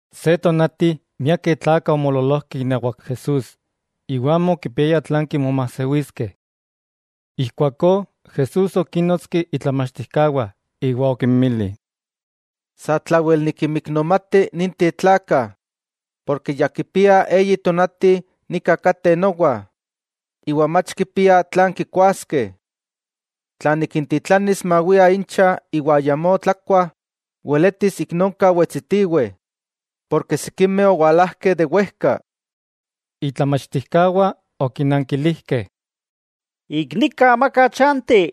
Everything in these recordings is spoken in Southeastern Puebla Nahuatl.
Se tonati miakeh tlakah omoololojkeh inawak Jesús, iwa amo okipiayah tlan kimomajsewiskeh. Ijkuakó Jesús okínnotski itlamachtijkawah iwa okinmili: —Satlawel nikinmiknomati ninteh tlakah, porke ya kipiah eyi tonati nika kateh nowa, iwa mach kipiah tlan kikuaskeh. Tla nikintitlanis mawiah incha iwa ayamó tlakuah, weletis ik nonka wetsitiweh, porke sikimeh owalajkeh de wejka. Itlamachtijkawah okinankilijkeh: —Ik nika amaka chanti,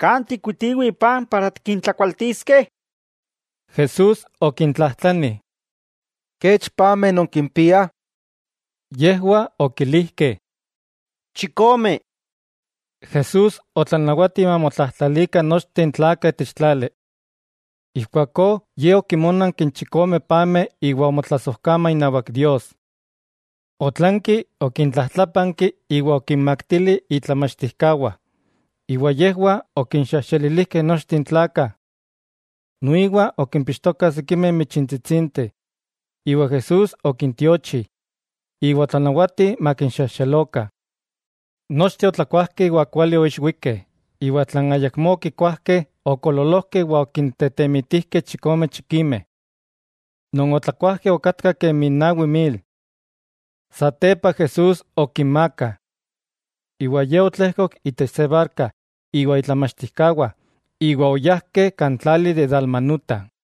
¿kan tikkuitiweh paj para tikintlakualtiskeh? Jesús okintlajtlani: —¿Kech pameh nonkimpiah? Yejwah okilijkeh: —Chikome. Jesús otlanawati mamotlajtlalikah nochteh n tlakah itech tlali. Ijkuakó Ye okinmónanki n chikome pameh iwa omotlasojkama inawak Dios. Otlanki okintlajtlápanki iwa okinmaktili itlamachtijkawah, iwa yejwah okinxejxelilijkeh nochteh n tlakah. Noiwa okimpixtokah sikimeh michintsitsinteh, iwa Jesús okintiochi, iwa otlanawati makinxejxelokah. Nochteh otlakuajkeh iwa kuali oixwikeh, iwa tlan ayakmó okikuajkeh okoololojkeh iwa okintetemitijkeh chikome chikimeh. Non otlakuajkeh okatkah kemi nawi mil. Satepa Jesús okinmaaka. Iwa Ye otlejkok itech se barka iwa itlamachtijkawah, iwa oyajkeh kan tlali de Dalmanuta.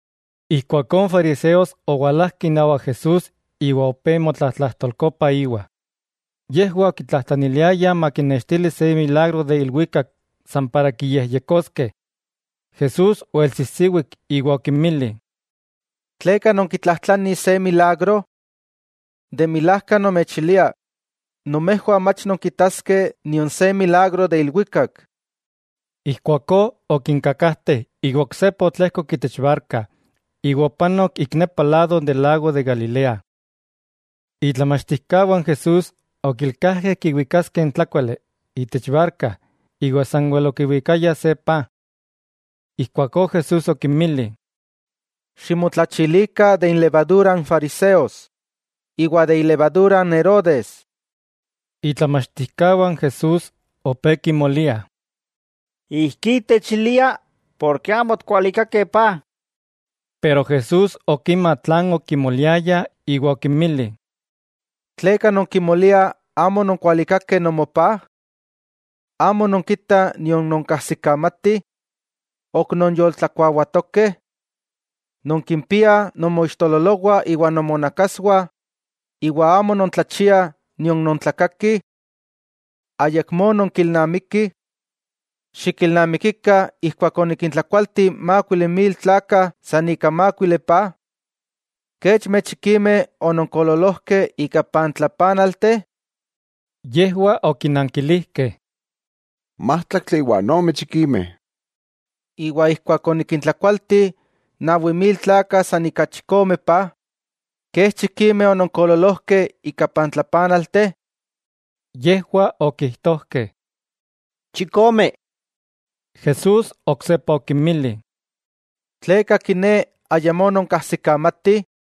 Ijkuakó n fariseos owalajkeh inawak Jesús iwa opé motlatlajtolkopah íwa. Yejwah okitlajtlaniliayah makinnextili se milagro de ilwikak san para kiyejyekoskeh. Jesús oelsijsiwik iwa okinmili: —¿Tleka nonkitlajtlanih se milagro? De milajka nomechilia nomejwah mach nonkitaskeh nion se milagro de ilwikak. Ijkuakó okinkakajte iwa oksepa otlejkok itech barka, iwa opanok ik nepa lado de n lago de Galilea. Itlamachtijkawah n Jesús okilkajkeh kiwikaskeh n tlákuali itech barka iwa sanwel okiwikayah se paj. Ijkuakó Jesús okinmili: —Ximotlachilikah de inlevadura n fariseos iwa de ilevadura n Herodes. Itlamachtijkawah n Jesús opé kimoliah: —Ijkí techilia porke amo otikwalikakeh paj. Pero Jesús okima tlan okimoliayah iwa okinmili: —¿Tleka non kimoliah amo ononkualikakeh nomopáj? ¿Amo nonkitah nion nonkajsikamatih? ¿Ok nonyoltlakuawatokeh? ¿Nonkimpiah nonmoixtololowah iwa nomonakaswah, iwa amo nontlachiah nion nontlakakih? ¿Ayakmó nonkilnamikih? Xikilnamikikah ijkuak onikintlakualti mákuili mil tlakah san ika mákuili paj, ¿kechmeh chikimeh ononkoololojkeh ika pantlapanalteh? Yejwah okinankilijkeh: —Májtlaktli iwa ome chikimeh. —Iwa ijkuak onikintlakualti nawi mil tlakah san ika chikome paj, ¿kech chikimeh ononkoololojkeh ika pantlapanalteh? Yejwah okijtojkeh: —Chikome. Jesús oksepa okinmili: —¿Tleka kiné ayamó nonkajsikamatih?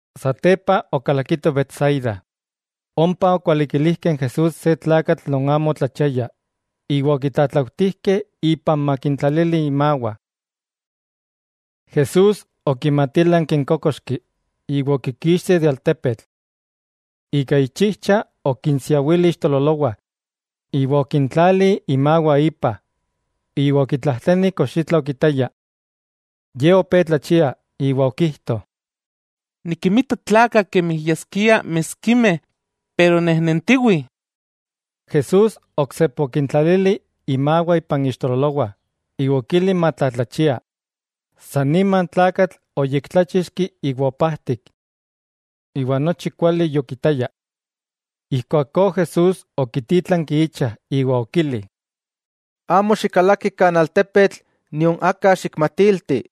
Satepa okalakitoh Betsaida, ompa okualikilijkeh n Jesús se tlakatl non amo otlachiaya iwa okitlatlautijkeh ipan makintlalili imawah. Jesús okimatílanki n kókoxki iwa okikixti de altepetl. Ika ichijcha okinsiawili ixtololowah iwa okintlali imawah ipa, iwa okitlajtlani kox itla okitaya. Ye opé tlachia, iwa okijto: —Nikinmita tlakah kemi yaskiah miskimeh, pero nejnentiwih. Jesús oksepa okintlalili imawah ipan ixtololowah iwa okili matlatlachia, san nima n tlakatl oyektláchixki iwa opajtik. Iwa nochi kuali yokitaya. Ijkuakó Jesús okitítlanki icha iwa okili: —Amo xikalaki kan altepetl, nion aka xikmatilti.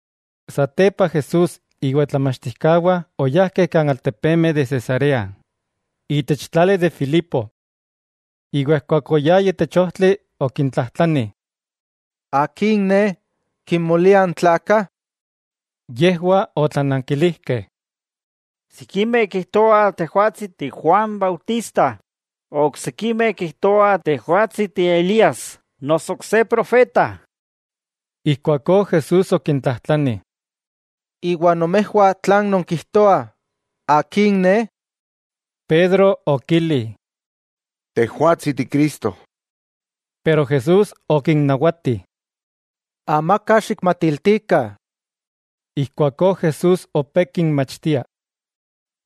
Satepa Jesús iwa itlamachtijkawah oyajkeh kan altepemeh de Cesarea itech tlali de Filipo. Iwa ijkuak oyayah itech ojtli okintlajtlani: —¿Akin Ne, kimoliah n tlakah? Yejwah otlanankilijkeh: —Sikimeh kijtoah Tejwatsi ti Juan Bautista, oksikimeh kijtoah Tejwatsi ti Elías noso ok se profeta. Ijkuakó Jesús okintlajtlani: —Iwa nomejwah tlan nonkijtoah, ¿Akin Ne? Pedro okili: —Tejwatsi Ti Cristo. Pero Jesús okinnawati: —Amaka xikmatiltikah. Ijkuakó Jesús opé kinmachtia: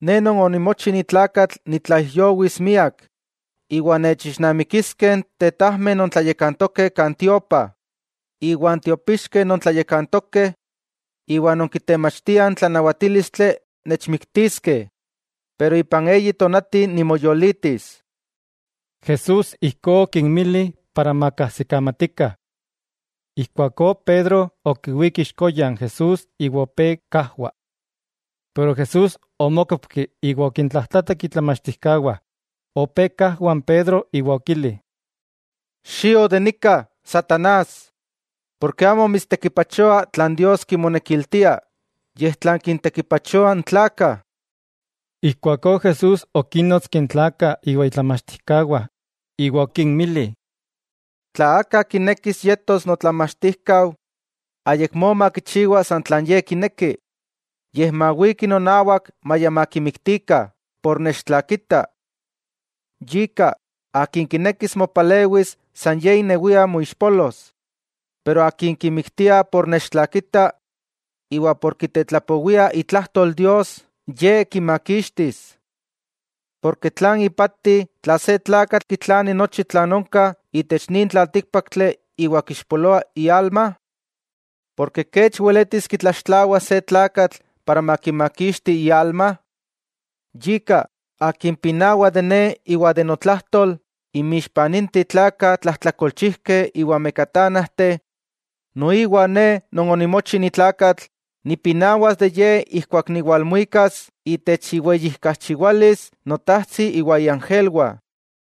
—Ne Non onimochi ni tlakatl nitlaijyowis miak iwa nechixnamikiskeh n tetajmeh non tlayakantokeh kan tiopa, iwa n tiopixkeh non tlayakantokeh iwa non kitemachtiah n tlanawatílistli nechmiktiskeh, pero ipan eyi tonati nimoyolitis. Jesús ijkó okinmili para makajsikamatikah. Ijkuakó Pedro okiwík ixkoya n Jesús iwa opé kajwa. Pero Jesús omókopki iwa okintlajtlatak itlamachtijkawah, opé kajwa n Pedro iwa okili: —¡Xio de nika, satanás!, porke amo mitstekipachoa tlan Dios kimonekiltia, yej tlan kintekipachoa n tlakah. Ijkuakó Jesús okínnotski n tlakah iwa itlamachtijkawah iwa okinmili: —Tla aka kinekis yetos notlamachtijkau, ayakmó makichiwa san tlan ye kineki, yej mawiki nonawak maya makimiktikah por nechtlakita. Yika, akin kinekis mopalewis san ye inewia moixpolos. Pero akin kimiktiah por nechtlakita iwa por kitetlapowia itlajtol Dios, Ye kimakixtis. Porke ¿tlan ipati tla se tlakatl kitlani nochi tlan onka itech nin tlaltíkpaktli iwa kixpoloa ialma? ¿Kech weletis kitlaxtlawas se tlakatl para makimakixti ialma? Yika, akin pinawa de Ne iwa de notlajtol inmixpa ninteh tlakah tlajtlakolchijkeh iwa mekatánajteh, noiwa Ne Non onimochi ni tlakatl nipinawas de ye ijkuak niwalmuikas itech iweyijkachiwalis Notajtsi iwa iangelwah.